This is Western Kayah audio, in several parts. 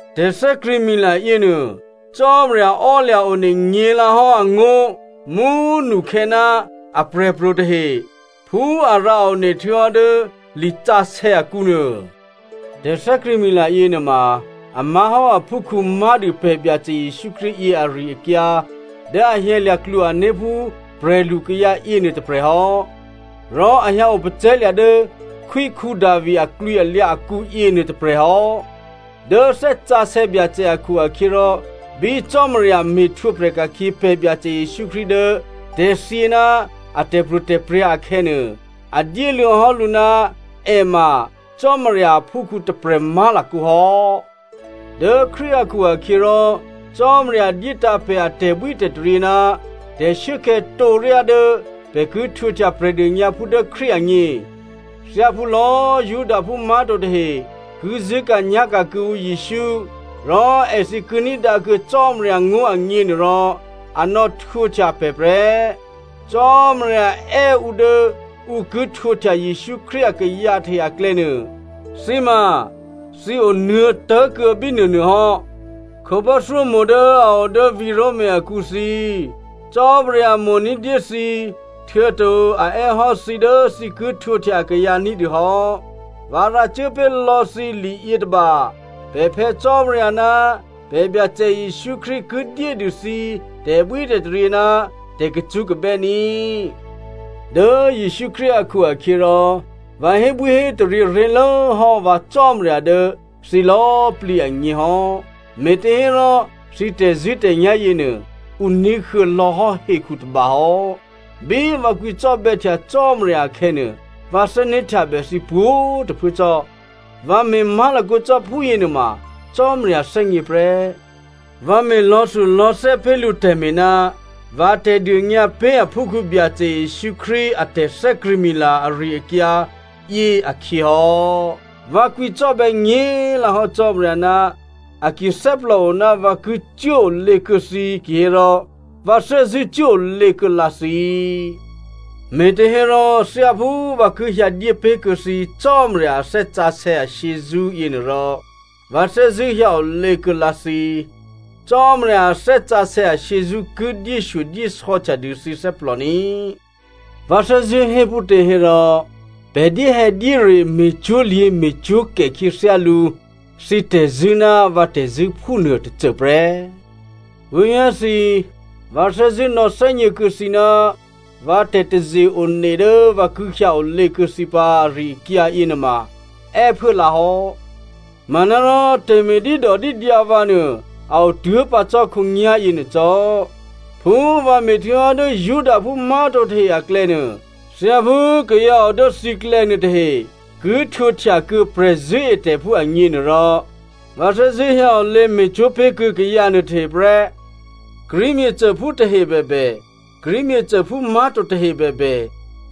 Tè̤thè́krṳ̂̌mila yěnuô, Cò́marya ò́lya̤ one nyě̤lǎhò́ angó̤ mú꤮ nukhè̌ ná aprè̤pro̤ tahe phú a rǎone htuô̌hò́ dố lisǎsè̌ akǔnuô. Tè̤thè́krṳ̂̌mila yěnuôma a má̤hò́ aphúkhǔ má̤dû pè̤ Byacè Jesǔ Krístu yě ari-akyǎ dố a hyǎlya̤ klwo-ané̤ phú prè̤lukayǎ yěnuô tôprè̤ hò́, rò a hyǎ opacè̤̌lya̤ dố khwí Davi aklwǐalyǎ akǔ yěnuô tôprè̤ hò́. Dố Thè́ Sǎsè̌ Byacè akhu-akhyěrò bí Cò́marya me̤htwǒprè̤ ka̤khyě pè̤ Byacè Jesǔ Krístu dố tè̤thyě ná a tè̤pro̤tè̤prya̤ akhè̌nuô, a dyéluô̌ hò́ lǔ ná è ma Cò́marya aphúkhǔ tôprè̤ má̤lakǒ hò́. Dố Krístu akhu-akhyěrò Cò́marya dyétǎ̤ pè̤ a tè̤bwítè̤taryě ná tè̤shuốkhè̌ tǒryá dố pè̤ ki htwǒhtya Prè̤dônyǎphú dố Krístu agně. Thyáphú lò̌꤮ Judaphú má̤to tahe ki zṳ̂́ka̤nyá̤ka̤ kuô̌ǔ Jesǔ, rò èthǐ ki ní̤dǎkuô̌ Cò́marya ngó̤ agněnuôrò, a nò̌htwǒhtya pè̤ prè́. Cò́marya è́ ǔ dố ǔ ki htwǒhtya Jesǔ Krístu akayǎ tahe aklè̌nuô, thǐ ma thǐ onuô̌tố̤kuô̌ bínuônuô hò́. Khǒbò́thyómo̤ dố a o dố vǐ̤ Roma akǔ thǐ, Cò́marya mo̤ ní̤dyé thǐ, htuô̌to a è́ hò́ thǐ dố thǐ ki htwǒhtya akayǎ ní̤dû hò́. Vǎ rǎcuố pé̤lò̌ thǐ liyětôba. Pè̤ Phè̌ Cò́marya ná pè̤ Byacè Jesǔ Krístu ki dyédû thǐ tè̤bwítè̤taryě ná tè̤kacṳ́kabè́ ní꤮. Dố Jesǔ Krístu akhu-akhyěrò, vǎ hébwíhétaryě ré̤lố hò́ vǎ Cò́marya dố thǐ lò̌꤮ plǐ agně hò́, me̤těhérò, thǐ tè̤zṳ̂́tè̤nyá̤ yěnuô, ǔ ní̤huô̌ lò̌hò́ hekhu tôba hò́. Bí vǎ kwǐcò́bè̌htya Cò́marya akhè̌nuô, vǎ thè́né̤htyabè thǐ pwǒ̤꤮ tôphuố cò́. Vǎ me̤ má̤lakǒ cò́ phúyě nuôma Cò́marya thè́gně prè́. Vǎ me̤ lò̌thulò̌thè́ pé̤ lǔ tè̤me̤ ná vǎ tè̤dônyǎ pé̤ aphúkhǔ Byacè Jesǔ Krístu a tè̤thè́krṳ̂̌mila ari-akyǎ yě akhyě hò́. Vǎ kwǐcò́bè̌ nyě̤꤮ lǎhò́ Cò́marya, a ki thè́plòo ná vǎ ki cuốolě kuô̌ thǐ kihérò vǎ thè́zṳ̂́ cuốolě kuô̌lǎ thǐ. Me̤těhérò thyáphú vǎ ki hyǎ dyé pé̤kuô̌ thǐ Cò́marya a Thè́ Sǎsè̌ ashyězṳ́ yěnuôrò, vǎ thè́zṳ̂́ hyǎ olě kuô̌ lǎ thǐ. Cò́marya a Thè́ Sǎsè̌ ashyězṳ́ ki dyéshyodyésò̌htya dû thǐ thè́plò ní꤮. Vǎ thè́zṳ̂́ hé phútě hérò pè̤ dyéhè̌dyére me̤cwó̤lyě̤ me̤cwó̤kè khyěthyálǔ thǐ tè̤zṳ̂́ ná vǎ tè̤zṳ̂́ phúnuô tôcôprè́. Puố̤vyá̤ thǐ꤮, vǎ thè́zṳ̂́ nò̌thè́gně kuô̌ thǐ ná vǎ tè̤taze-one dố vǎ ki hyǎ olě kuô̌ thǐ pǎ ari-akyǎ yěnuôma è́phuố lǎhò́. Manárò tè̤me̤ dídòdídyǎ vǎ nuô a o tuố̤pǎ cò́ khǒnyá̤ yěnuô cò́. Phú vǎ me̤htuô̌hò́ dố Judaphú má̤to tahe aklè̌nuô, thyáphú kayǎ o dố thǐklè̌ nuôtahe ki htwǒhtyakuô̌ prè̤zṳ̂́etè̤phú agněnuôrò, vǎ thè́zṳ̂́ hyǎ olě me̤cwó̤ pé̤ kuô̌ kayǎ nuôtahe prè́. Greek myěcôphú tahe bèbè, Greek myěcôphú má̤to tahe bèbè,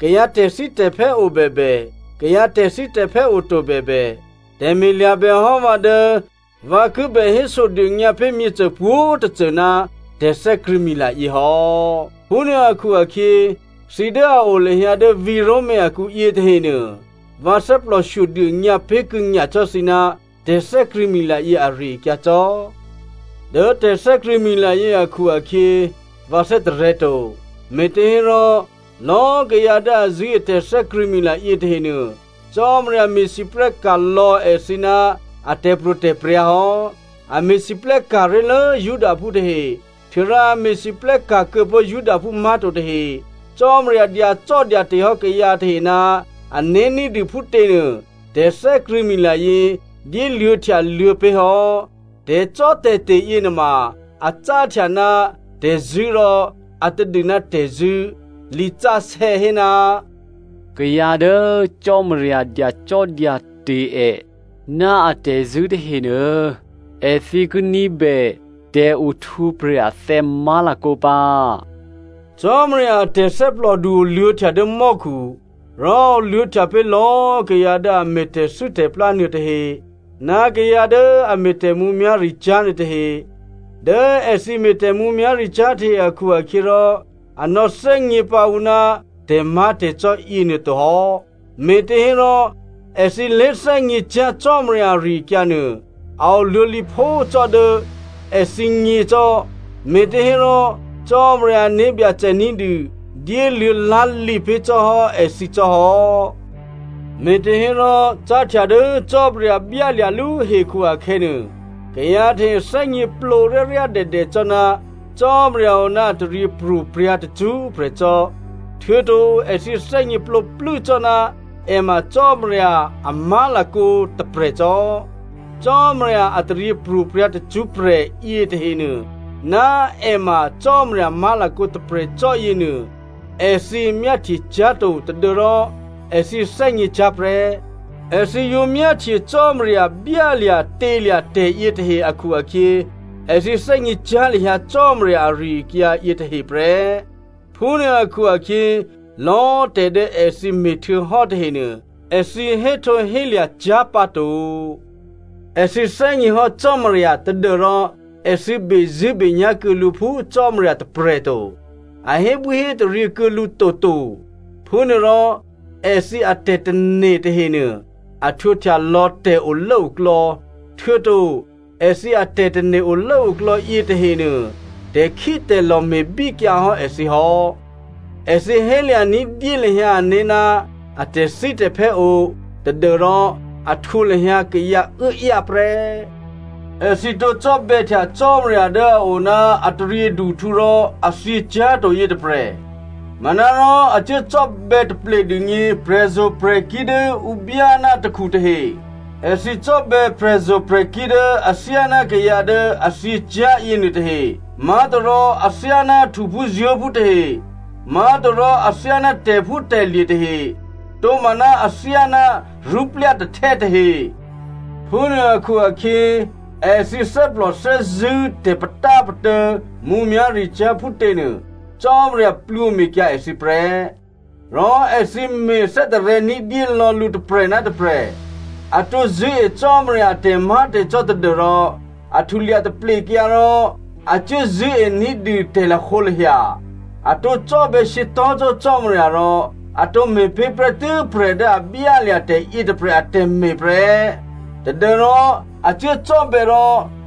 kayǎ tè̤thítè̤phè́ o bèbè, kayǎ tè̤thítè̤phè́ oto bèbè, tè̤me̤ lya̤bèhò́ vǎ dố vǎ kibè hésodônyǎ pé̤ myěcô pwǒ̤꤮ tôcô ná tè̤thè́krṳ̂̌mila yěhò́. Phúnuô akhu-akhyě thǐ dố a o lahyǎ dố vǐ̤ Roma akǔ yětahenuô, vǎ thè́plòshyo dônyǎ pé̤kuô̌ nyacò́ thǐ ná tè̤thè́krṳ̂̌mila yě ari-akyǎ cò́. Dố tè̤thè́krṳ̂̌mila yě akhu-akhyě, vǎ thè́tarè̤̌to, me̤těhérò, lò̌꤮ kayǎ dố a zṳ̂́e tè̤thè́krṳ̂̌mila yětahenuô, Cò́marya me̤lwóhteka̤ lò̌ èthǐ ná a tè̤pro̤tè̤prya̤ hò́. A me̤lwóhteka̤ ré̤lố Judaphú tahe, htuô̌rò a me̤lwóhteka̤ kuô̌pó̤ Judaphú má̤to tahe. Cò́marya dyacò́dyate̤ hò́ kayǎ tahe ná ané̤ ní̤dû phútěnuô tè̤thè́krṳ̂̌mila yě dyéluô̌htyaluô̌ pé̤ hò́. Tè̤cò́tè̤te̤ yěnuôma a cáhtya ná tè̤zṳ̂́ rò a tadû ná tè̤zṳ̂́. Lisǎsè̌ hé, “Kayǎ dố Cò́marya dyacò́dyate̤ è ná atè̤zṳ̂́ tahenuô, èthǐ ki ní̤bè tè̤ohtwǒprè̤ athè̌ má̤lakǒ pǎ.” Cò́marya a tè̤thè́plòdu oluô̌htya dố mò́khu. Rò a oluô̌htya pé̤ lò̌꤮ kayǎ dố a me̤ tè̤thû́tè̤plá nuôtahe ná kayǎ dố a me̤ tè̤mǔmyá̤ricyá̤ nuôtahe. Dố èthǐ me̤ tè̤mǔmyá̤ricyá̤ tahe akhu-akhyěrò a nò̌ thè́gně pǎ ǔ ná tè̤má̤tè̤cò́ yěnuô to hò́. Me̤těhérò èthǐ lé̤thè́gněcyá̤ Cò́marya ari-akyǎ nuô, a oluô̌ lǐphó cò́ dố èthǐgně cò́, me̤těhérò Cò́marya ané̤byacè ní̤dû dyéluô̌ lá̤lǐ pé̤ cò́ hò́ èthǐ cò́ hò́. Me̤těhérò cáhtya dố Cò́marya byálya̤lú hekhu akhè̌nuô, kayǎ tahe thè́gněplǒ ryáryádèdè cò́ ná Cò́marya o ná a taryěpro̤prya̤ tacṳ́prè̤ cò́, htuô̌to èthǐ thè́gně plǒplû́ cò́ ná è ma Cò́marya a má̤lakǒ tôprè̤cò́. Cò́marya a taryěpro̤prya̤ tacṳ́prè̤ yětahenuô ná è ma Cò́marya má̤lakǒ tôprè̤ cò́ yěnuô, èthǐ myáhtyecyá̤ to tadû́rò èthǐ thè́gněcyá̤ prè́. Èthǐ yǒ myáhtye Cò́marya byálya̤tělya̤ tè̤yětahe akhu-akhyě, èthǐ thè́gněcyá̤ lahyǎ Cò́marya ari-akyǎ yětahe prè́. Phúnuô akhu-akhyě, lò̌꤮ tè̤dố èthǐ me̤htuô̌hò́ tahenuô, èthǐ héhtǒhélya̤ cyá̤ pǎto. Èthǐ thè́gněhò́ Cò́marya tadû́rò èthǐ bezṳ̂́benyá̤ kuô̌ lǔ phú Cò́marya tôprè̤ to. A hébwíhétaryě kuô̌ lǔ toto. Phúnuôrò èthǐ atè̤tane̤ tahenuô, a htwǒhtya lò̌ tè̤olốoklò̌. Htuô̌to èthǐ atè̤tane̤ olốoklò̌ yětahenuô, tè̤khítè̤lò̤ me̤bíkyǎ hò́ èthǐ hò́. Èthǐ hélya̤ ní̤dyé lahyǎ ané̤ ná a tè̤thítè̤phè́ o, tadû́rò a htwǒ lahyǎ kayǎ uốáyá prè́. Èthǐ tǒ cò́bè̌htya Cò́marya dố a o ná a taryěduhtǔ rò a thyěcyá̤to yětôprè̤, manárò a cuố cò́bè̌ taplédûgně prè̤zo̤prè̤kí̤ dố ǔ byá ná takhu tahe. Èthǐ cò́bè̌ prè̤zo̤prè̤kí̤ dố athyáná kayǎ dố a thyěcyá̤ yěnuôtahe, má̤torò athyáná htuphúzuố̤phú tahe, má̤torò athyáná tè̤phútè̤lye̤ tahe, tomaná athyáná rṳ́plya̤ tahtè́ tahe. Phúnuô akhu-akhyě, èthǐ thè́plò thè́zṳ̂́ tè̤patápatô̌ mǔmyá̤ricyá̤ phútěnuô, Cò́marya plwǒme̤kyǎ èthǐ prè́. Rò èthǐ me̤ thè́tarè̤̌ ní̤dyé lò̌ lǔ tôprè̤ ná tôprè̤. A tǒ zṳ̂́e Cò́marya a tè̤má̤tè̤cò́ tadû́rò a htulya taplekyǎ rò a cuố zṳ̂́e ní̤dû tè̤lahǒlahya. A tǒ cò́bè̌ shyětò̤́cò́ Cò́marya rò a tǒ me̤pé̤ prè́tû́ prè̤ dố a byálya̤ tè̤ yětôprè̤ atè̤me̤ prè́ tadû́rò a cuố cò́bè̌ rò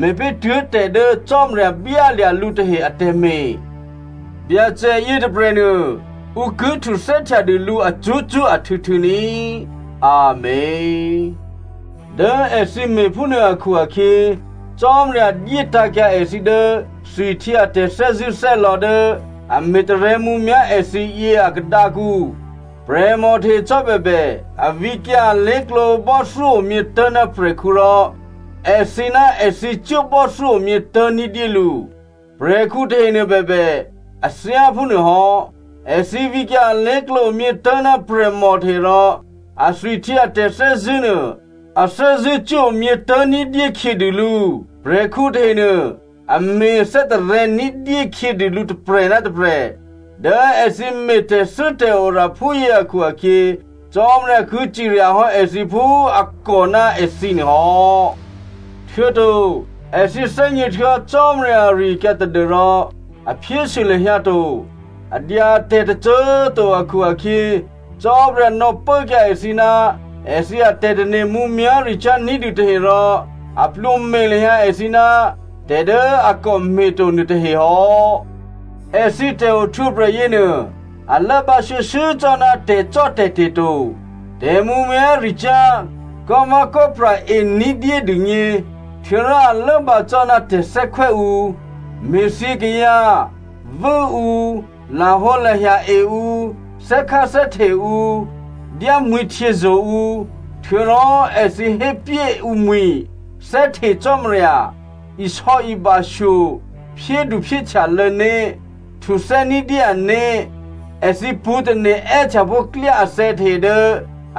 me̤pé̤ tuố̤ tè̤ dố Cò́marya byálya̤ lǔ tahe atè̤me̤. Byacè yětôprè̤nuô ǔ ki htuthè́htya dû lǔ acṳ́cṳ́ ahtû̌htû̌ ní꤮. Amèn. Dố èthǐ me̤phúnuô akhu-akhyě, Cò́marya dyétǎ̤kyǎ èthǐ dố thwihtyě a tè̤thè́zṳ̂́thè́lò̌ dố a me̤tarè̤̌ mǔmyá̤ èthǐ yě a khadǎkǔ. Prè̤mò tahe cò́ bèbè, a vǐkyǎ alé̤klǒ bò́thyó omyětố̤ ná prè̤khǔ rò èthǐ ná èthǐ cuố bò́thyó omyětố̤ ní̤dyé lǔ. Prè̤khǔ tahenuô bèbè a thyáphúnuôhò́. Èthǐ vǐkyǎ alé̤klǒ omyětố̤ ná prè̤mò tahe rò athwihtyě a tè̤thè́zṳ̂́ nuô a thè́zṳ̂́cuố omyě tố̤ ní̤dyé khyědû lǔ. Prè̤khǔ tahenuô a me̤ thè́tarè̤̌ ní̤dyé khyědû lǔ tôprè̤ ná tôprè̤. Dố èthǐ me̤tè̤thû́tè̤ora phúyě akhu-akhyě, Cò́marya ki cirya hò́ èthǐ phú a kò ná èthǐnuô hò́. Htuô̌to èthǐ thè́gně htuô̌hò́ Cò́marya ari-akyǎ tadû́rò, a phyésû lahyǎ to, a dya tè̤tôcô꤮ to akhu-akhyě, Cò́marya nò̌pốkyǎ èthǐ ná èthǐ atè̤tane̤ mǔmyá̤ricyá̤ ní̤dû tahe rò a plwǒme̤ lahyǎ èthǐ ná tè̤ dố a kò me̤to nuôtahe hò́. Èthǐ tè̤ohtwǒprè̤ yěnuô a lốbǎ shuô̌shuô̌ cò́ ná tè̤cò́tè̤te̤ to, tè̤mǔmyá̤ricyá̤, kò́vè̌kò́pra ení̤dyé dûgně, htuô̌rò a lốbǎ cò́ ná tè̤thè́khwè́ ǔ, me̤thyě kayǎ, vû́ǔ, lahǒlahya-e ǔ, thè́kháthè́hte ǔ, dyámwi̤htyězo̤ ǔ. Htuô̌rò èthǐ hépyé ǔmwi̤, thè́hte Cò́marya, isò̌ibashyo, phyédu phyéhtyalô̌ né̤, htuthè́ ní̤dyé ané̤. Èthǐ pṳ̌tane̤ è́htyapó̤ klyá athè̌ tahe dố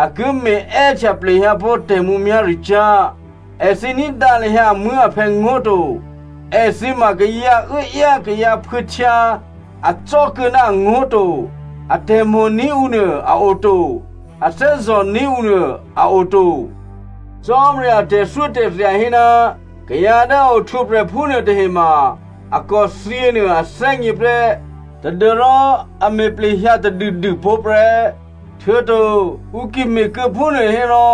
a ki me̤ è́htya plehyǎpó̤ tè̤mǔmyá̤ricyá̤. Èthǐ ní̤dǎ lahyǎ amuố̤aphè̌ ngó̤ to. Èthǐ ma kayǎ uốáyá kayǎ phuô̌htyǎ, acò́ kuô̌ ná angó̤ to. A tè̤mo̤ní̤ ǔnuô, a oto, a thè́zò̤ní̤ ǔnuô a oto. Cò́marya a tè̤thyótè̤thya hé ná kayǎ dố a ohtwǒprè̤ phúnuô tahe ma a kòthyě nuô a thè́gně prè́ tadû́rò a me̤ plehyǎ tadûdûpó̤ prè́. Htuô̌to ǔ ki me̤kuô̌ phúnuô hérò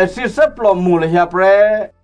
èthǐ thè́plòmo̤ lahyǎ prè́.